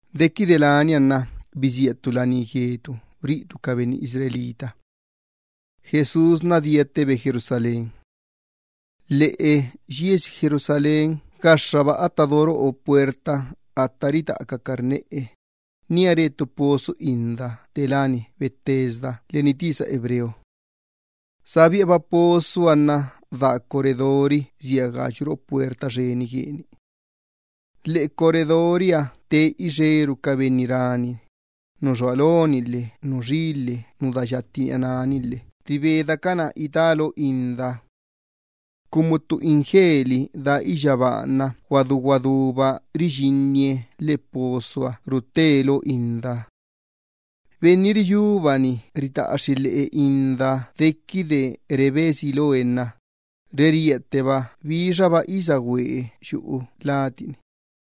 Dequide lania nna bisía ttu laní gue ca benni Israel. Jesús diattebe Jerusalén. Lheꞌe yiesi Jerusalén gaxxaba atta do roꞌo puerta atta ritaꞌa ca carneꞌe, nía re ttu pozo inda te láni Betesda leni tisa hebreo. Sa biꞌaba pozoha nna daa corredori sia gayu roꞌo puerta xxeni gueni. Lheꞌe corredoriha te ixeru ca benni rani, nu xua loni lhe nu xi lhe nu daa yatti niꞌa náni lhe ribedacana ita lo indaha. Cumu ttu ingeli daa iyyabaaha nna guadú guadúba riyinnibi lheꞌe pozoha ruttábi lo indaha. Benni riyúbani ritaꞌaxxi lheꞌe indaha dequide rebe si loe nna, reríatteba bixaba isagüe yuꞌu cuerpu gueni.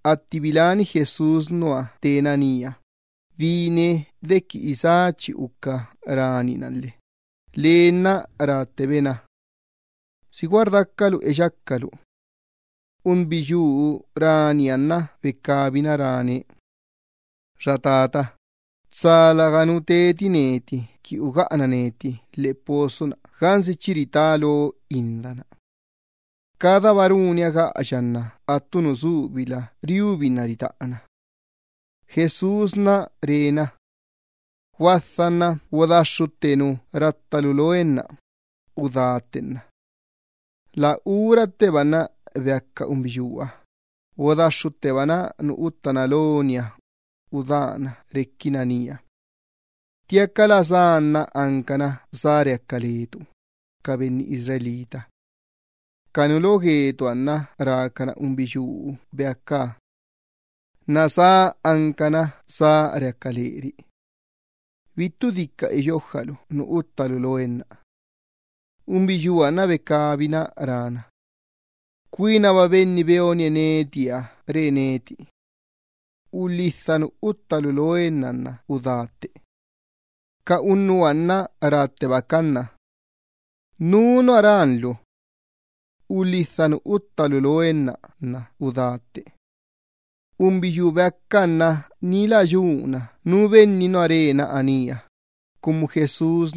Atti biláni Jesús nua tena nía, bine dequi isá chi uca ranina lhe lee nna ráttebe na: —¿Si gua rdacalu eyacalu? Unbiyuu raniha nna becabina ráne: —Benni bananie neti, tsa läganu teti neti qui ugaꞌana neti lheꞌe pozo-na gansi chi ritá lo inda-na. Cadaba runia gaꞌaya nna attu nu subila riubinna ritaꞌana. Jesús re na: —Guadha nna bodaxxutte nu rattalu loenna udátte. La uratteba nna beaca unbiyuuha, atti bodaxxuttebana nu uttána loniha, udána requina nía. Ttiaca la sá-na ancana sá redí le ca benni Israel. Ca nu lo gue ca benni Israel nna rácana unbiyuu beacaha: —Nasá anca sá redí leri. Bittu dica eyojalu nu uttalu loen-na. Unbiyuuha nna becabina rána: —Cuinaba Benni beonie netiha re neti: “Ulhidha nu uttalu loen-na nna udá tte.” Ca unnuha nna ráttebacan na: —¿Nú nua rán lu: “Ulhidha nu uttalu loen-na nna udátte”? Unbiyuu beacaha nna ni lä yuna nú benni nua re na anía, cumu Jesús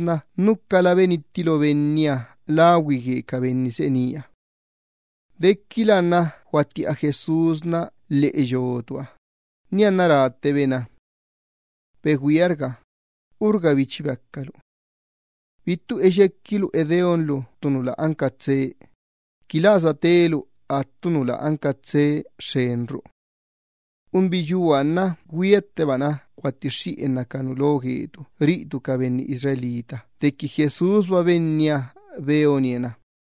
nucala benitti lo benniha lagüi gue ca benni seꞌe nía. Dequila nna guattiꞌa Jesús nua lheꞌeliꞌa gue yotuha, nianna ráttebe na: —Begüiarga, urgabi chi beacalu. Bittu eyequilu edeonlu ttu nu lä anca tsee, qui lä satelu attu nu lä anca tsee xxenru. Unbiyuuha nna güiattebana guattixxiꞌenna ca nu lo gue ca benni Israel dequi Jesúsba Benniha beonie na.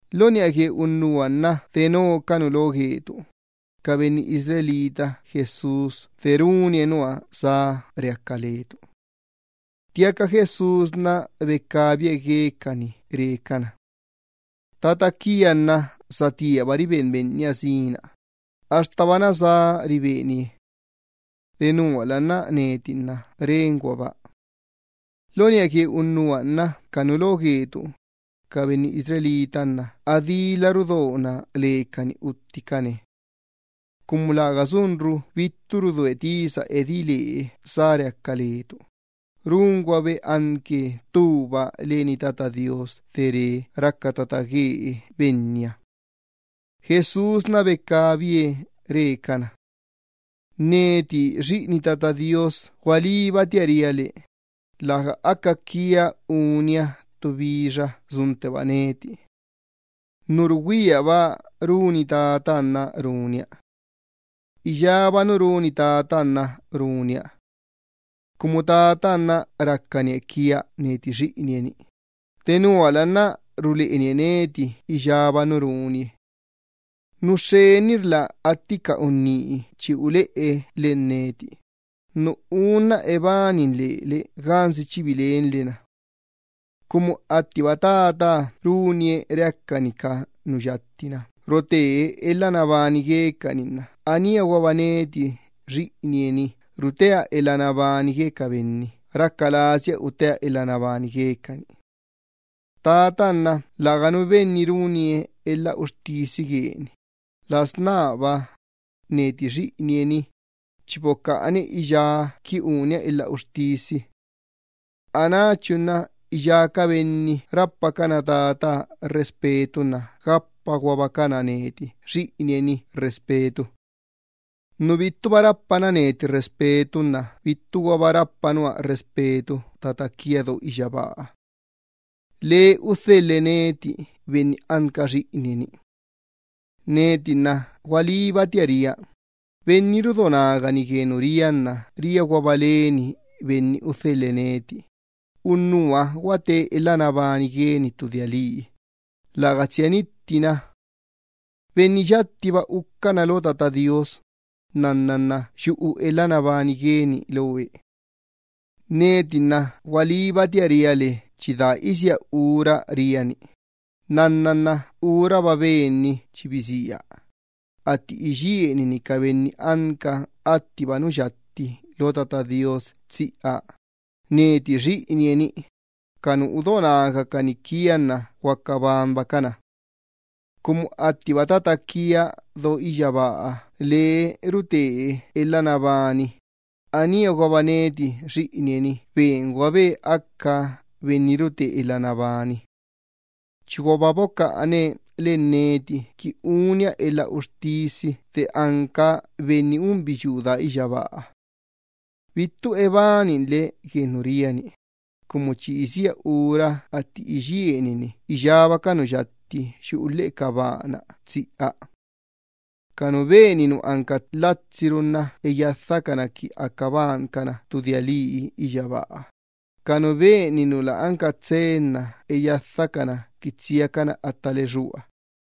Lo niꞌa gue unnuha nna besía le ca nu lo gue ca benni Israel Jesús de runie nua sá redí letu. Ttiaca Jesús becabie guecani re cana: —Tata quia nna satíaba riben Benniha sina, axtaba nasá ribenie. Denuala nna neti nna renguaba. Lo niꞌa gue unnuha nna ca nu lo gue ca benni Israel nna adíla bedona lecani utticane. Cumu läga sunru bittu rudoe tisa edí lee sá redí le ca nu Israel, ráguabe anque ttuba leni Tata Do Iyyabaaha de re raca tata guee Benniha. Nianna becabi Jesús re cana: —Neti Xiꞌini Tata Do Iyyabaaha gualíbatia ria le: Läga aca quia unia ttu bixa suntteba neti. Nu rugüiaba runi Tataha nna runia. Iyába nu runi Tataha nna runia. Cumu Tataha nna racanie quia neti Xiꞌinie-ni, denuala nna ruleꞌenie neti iyába nu runie. Nu xxenirla atti ca unní chi uleꞌe len neti, nu unna ebanin lele gansi chi bilenle na. Cumu attiba Tataha runie reacani ca nu yatti-na rote elha nabani guecani, aníaguaba neti Xiꞌinie-ni rutea elha nabani gue ca benni raca lasia utea elha nabani guecani. Tataha nna läganu benni runie elha uxtisi gueni, las nába, neti Xiꞌinie-ni, chi bocaꞌane iyá qui unia elha uxtisi. Anáchu nna iyá ca benni rapacana Tataha respeto nna gapaguabacana neti Xiꞌinie-ni respeto. Nu bittuba rapana neti respeto nna bittuguaba rapa nua respeto Tata quia do iyyabaaha. Lee udhelhe neti benni anca Xiꞌinie-ni. ’Neti nna gualíbatia ria, benni rudo nagani gue nu ria nna riaguaba leni benni udhelhe neti, unnuha nna guateba elha nabani gueni ttu dia lii, läga tsia nittina. Benni yattiba uca nua lo Tata Do Iyyabaaha, nnanna nna yuꞌu elha nabani gueni lo Ben-na. Neti nna gualíbatia ria le chi daa isía ura ria-ni, nnanna nna uraba Benni chi bisía, atti iyienini ca benni anca attiba nu yatti lo Tata Do Iyyabaaha tsiꞌa, neti Xiꞌinie-ni, ca nu udo nagacani quia nna guaca banbacana. Cumu attiba Tata quia do iyyabaaha lee rute elha nabani, aníaguaba neti Xiꞌinie-ni benguabe aca benni rute elha nabani. Chiguaba bocaꞌane las náya qui unia elha uxtisi de anca Benni unbiyuu daa iyyabaaha. Bittu ebaninle gue nu ria-ni, cumu chi isía ura atti iyienini iyába ca nu yatti yuꞌu lheꞌe ca baa-na tsiꞌa. Ca nu beni nu anca lhatsiru nna eyadhacana qui aca bancana ttu dia lii iyyabaaha, ca nu beni nu lä anca tsee nna eyadhacana qui tsiacana atta lexúaha.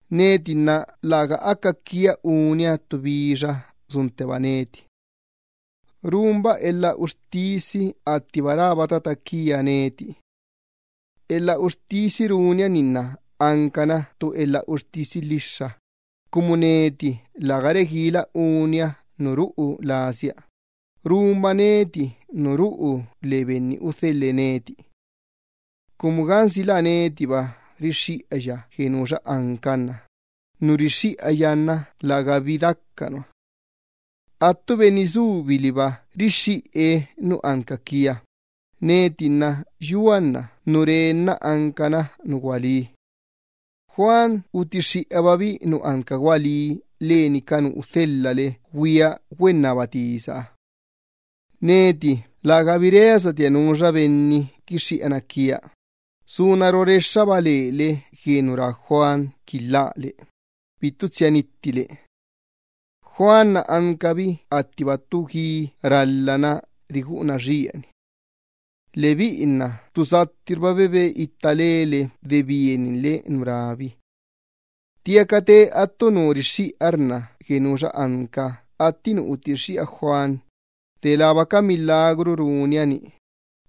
’Neti nna läga aca quia unia ttu bixa suntteba neti. Runba elha uxtisi attiba rába Tata quia neti. Elha uxtisi runia-ni nna ancana ttu elha uxtisi lhixxa, cumu neti läga reguila unia nu ruꞌu lasia, runba nu ruꞌu le benni udhelhe neti. Cumu gansi la netiba rixxiꞌaya gue nuxa anca nna nu rixxiꞌaya nna lägabi daca nua. Attu benni subi liba rixxiꞌe nu anca quia, neti nna yua nna nu re nna ancana nu gualí. Juan utixxiꞌababi nu anca gualí leni ca nu udhelhale güia güennaba tisaha. Neti lägabi reasatia nuxa benni quixxiꞌana quia, suna rorexxaba lele gue nu rá Juan qui lhále, bittu tsia nittile. Juan ancabi attiba ttu gui ralhana riguꞌuna xieni. Lebiꞌi nna ttu sattirba bebe itta lele de bieninle nu rábi. Ttiaca te attu nu rixxiꞌarna gue nuxa anca atti nu utixxiꞌa Juan, delába ca elha ban lasi runia-ni,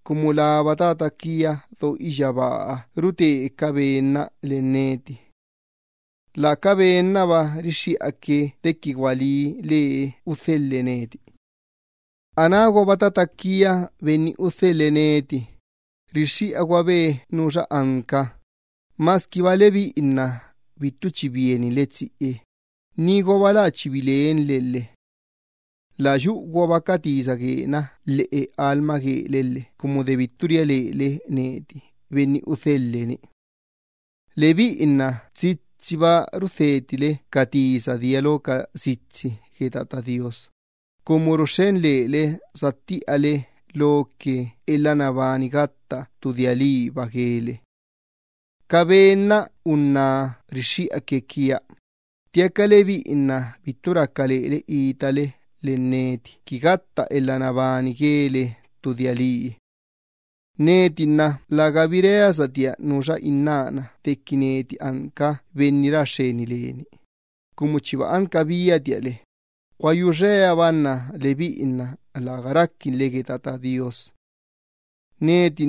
cumu laba Tata quia do iyyabaaha rute ca ben-na len neti. La ca ben-naba rixxiꞌaque dequi gualí lee udhelhe neti. Anáguaba Tata quia Benni udhelhe neti, rixxiꞌaguabe nuxa anca, masquiba lebiꞌi nna bittu chi bieninle tsiꞌe, niguaba lä chi bilenle lhe. Bittuguaba yuꞌu ca tisa gue Ben-na lheꞌe lastoole lhe cumu de bittu ria lele neti Benni udhelha Benna. Lebiꞌi nna tsitsiba rudhetile ca tisa dia lo ca sitsi gue Tata Do Iyyabaaha, cumu ruxxen lele sattiꞌale lo ca benna elha nabani gatta ttu dia liiba guele. Gua liba ca ben-na unná rixxiꞌaque quia, ttiaca lebiꞌi nna bittu raca lele itale len neti qui gatta elha nabani guele ttu dia lii. ’Neti nna lägabi reasatia nuxa innána dequi neti anca Benni ra xxeni leni, cumu chiba anca biatia le, gua yuxeaba lebiꞌi nna läga raquinle gue Tata Do Iyyabaaha. Neti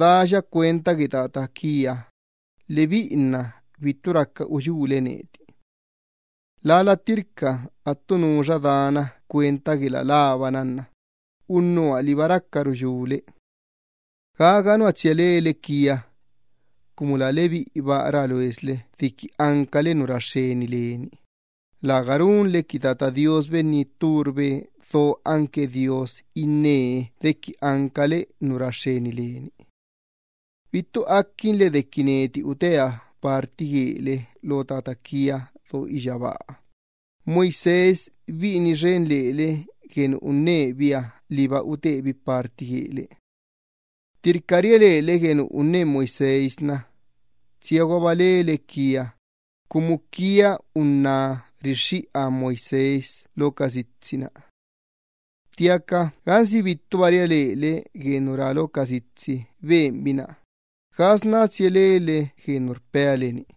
daya cuenta gue Tata quia, lebiꞌi nna bittu raca uyúle neti. Lala ttirca attu nuxa dana cuenta gue la labana nna unnuha liba raca ruyúle. Gaga nua tsia lele quia, cumu la lebiꞌiba rá loesle dequi ancale nu ra xxeni leni, läga runle qui Tata Do Iyyabaaha Benni tturbe do anque Dios innee ancale nu ra xxeni leni. Bittu aquinle dequi netiba udienni loa le lo Tata quia do iyyabaaha, Moisés biꞌini xen lele gue nu unnebiha liba udienni lobi le. Ttirca ria lele gue nu unne Moisés, tsiaguaba lele quia, cumu quionna rixxiꞌa Moisés lo ca sitsi-na. Ttiaca gansi bittuba ria lele gue nu rá lo ca sitsi benbi-na, ¿gasná tsia lele gue nu rpea le-ni?